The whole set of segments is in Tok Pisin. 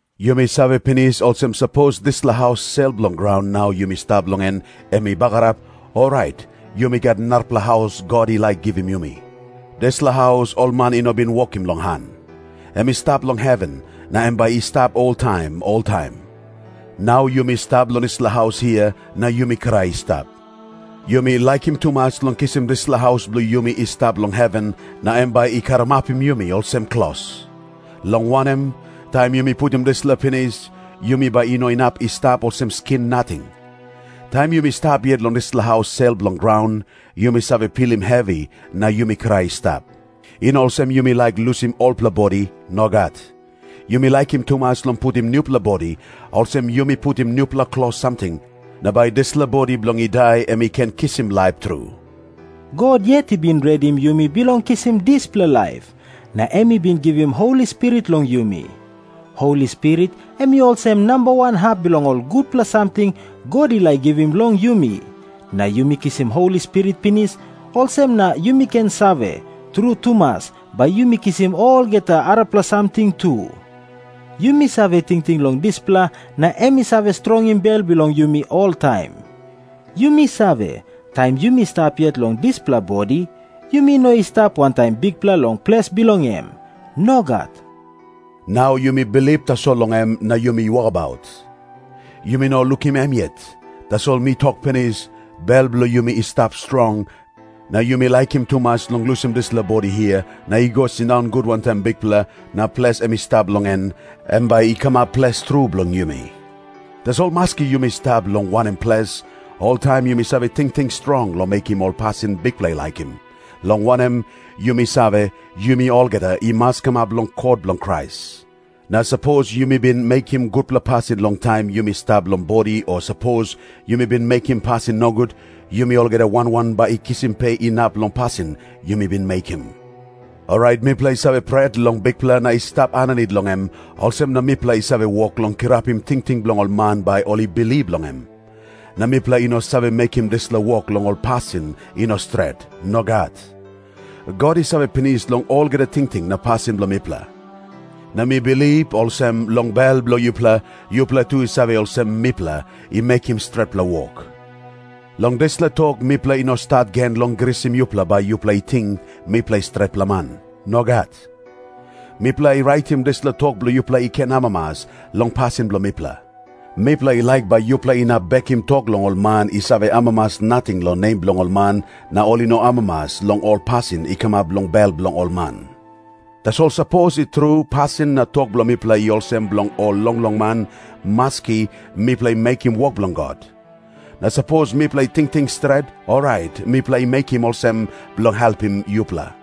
Yumi save pinis olsem, sapos dispela haus sel bilong graun nau yumi stap long en, em i bagarap, orait yumi gat narapela haus God i laik givim yumi. Dispela haus ol man i no bin wokim long han. Em i stap long heven, na em bai i stap oltaim oltaim. Nau yumi stap long dispela haus hia, na yumi krai i stap. Yumi laikim tumas long kisim dispela haus bilong yumi i stap long heven na em bai i karamapim yumi olsem klos. Long wanem, taim yumi putim dispela pinis, yumi bai i no inap i stap olsem skin nating. Taim yumi stap yet long dispela haus sel bilong graun, yumi save pilim hevi na yumi krai i stap. I no olsem yumi laik lusim olpela bodi. Nogat. Yumi laikim tumas long putim nupela bodi, olsem yumi putim nupela klos samting, na bai dispela bodi bilong i dai em i ken kisim laip tru. God yet i bin redim yumi bilong kisim dispela laip, na em i bin givim Holi Spirit long yumi. Holi Spirit em i olsem namba wan hap bilong ol gutpela samting God i laik givim long yumi. Na yumi kisim Holi Spirit pinis, olsem na yumi ken save, tru tumas bai yumi kisim olgeta arapela samting tu. Yumi save tingting long dispela na em i save strongim bel bilong yumi oltaim. Yumi save, taim yumi stap yet long dispela bodi, yumi no i stap wantaim Bikpela long ples bilong em. Nogat. Nau yumi bilip tasol long em na yumi wokabaut. Yumi no lukim em yet. Tasol mi tok pinis, bel bilong yumi i stap strong, na yumi laikim tumas long lusim dispela bodi hia na i go sindaun gut wantaim Bikpela, na ples em i stap long en, em bai i kamap ples tru bilong yumi. Tasol maski yumi stap long wanem ples, oltaim yumi save tingting strong long mekim ol pasin Bikpela i laikim, long wanem, yumi save, yumi olgeta i mas kamap long kot bilong Krais. Na sapos yumi bin mekim gutpela pasin long taim yumi stap long bodi o sapos yumi bin mekim pasin nogut, yumi olgeta wan wan bai i kisim pe inap long pasin yumi bin mekim. Orait mipela i save pret long Bikpela na i stap aninit long em, olsem na mipela i save wok long kirapim tingting bilong ol man bai ol i bilip long em. Na mipela i no save mekim dispela wok long ol pasin i no stret. Nogat. God i save pinis long olgeta tingting na pasin bilong mipela. Na mi bilip olsem, long bel bilong yupela, yupela tu i save olsem mipela i mekim stretpela wok. Long dispela tok mipela i no stat gen long grisim yupela bai yupela i ting mipela i stretpela man. Nogat. Mipela i raitim dispela tok bilong yupela i ken amamas long pasin bilong mipela. Mipela i laik bai yupela inap bekim tok bilong ol man i save amamas nating long nem bilong ol man, na ol i no amamas long ol pasin i kamap long bel bilong ol man. Tasol sapos i tru pasin na tok bilong mipela i olsem bilong ol longlong man, maski, mipela i mekim wok bilong God. Na sapos mipela i tingting stret, orait mipela i mekim olsem bilong helpim yupela.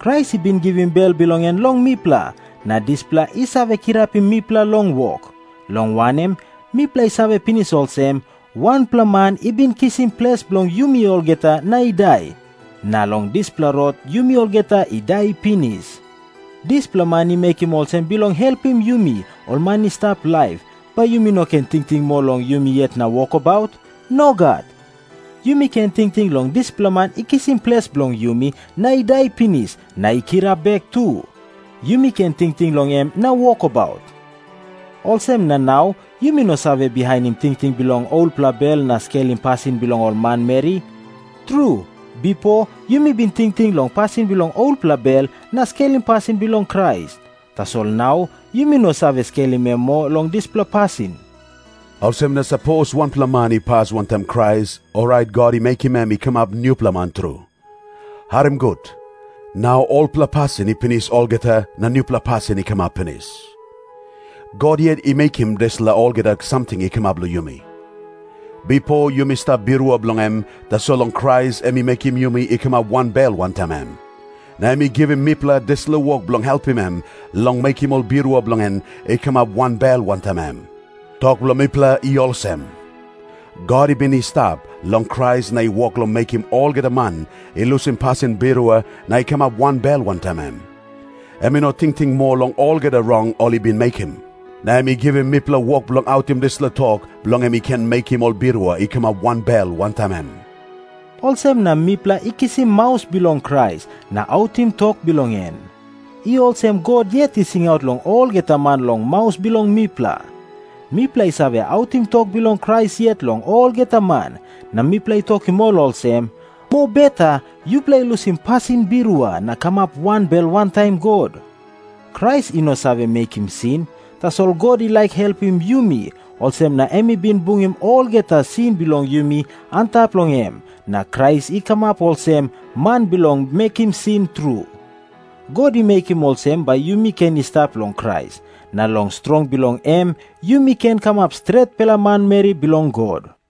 Krais i bin givim bel bilong en long mipela, na dispela i save kirapim mipela long wok, long wanem, mipela i save pinis olsem, wanpela man i bin kisim ples bilong yumi olgeta na i dai, na long dispela rot yumi olgeta i dai pinis. Dispela man i mekim olsem bilong helpim yumi ol man i stap laip, bai yumi no ken tingting moa long yumi yet na wokabaut. Nogat. Yumi ken tingting long dispela man i kisim ples bilong yumi na i dai pinis, na i kirap bek tu. Yumi ken tingting long em na wokabaut. Olsem na nau yumi no save bihainim tingting bilong olpela bel na skelim pasin bilong ol manmeri. Tru, bipo yumi bin tingting long pasin bilong olpela bel na skelim pasin bilong Krais. Tasol nau yumi no save skelim em moa long dispela pasin. Olsem na sapos wanpela man i pas wantaim Krais, orait God i mekim em i kamap nupela man tru. Harim gut. Nau olpela pasin i pinis olgeta, na nupela pasin i kamap pinis. God yet i mekim dispela olgeta samting i kamap long yumi. Bipo yumi stap birua bilong em, tasol long Krais em i mekim yumi i kamap wanbel wantaim em. Na em i givim mipela dispela wok bilong helpim em long mekim ol birua bilong en i kamap wanbel wantaim em. Tok bilong mipela i olsem. God i bin i stap long Krais na i wok long mekim olgeta man i lusim pasin birua na i kamap wanbel wantaim em. Em i no tingting moa long olgeta rong ol i bin mekim. Na em i givim mipela wok bilong autim dispela tok, bilong em i ken mekim ol birua i kamap wanbel wantaim em. Olsem na mipela i kisim maus bilong Krais na autim tok bilong en. I olsem God yet i singaut long olgeta man long maus bilong mipela. Mipela i save autim tok bilong Krais yet long olgeta man, na mipela i tokim ol olsem, “Mobeta yupela lusim pasin birua na kamap wanbel wantaim God.” Krais i no save mekim sin, tasol God i laik helpim yumi, olsem na em i bin bungim olgeta sin bilong yumi antap long em, na Krais i kamap olsem man bilong mekim sin tru. God i mekim olsem bai yumi ken i stap long Krais, na long strong bilong em yumi ken kamap stretpela manmeri bilong God.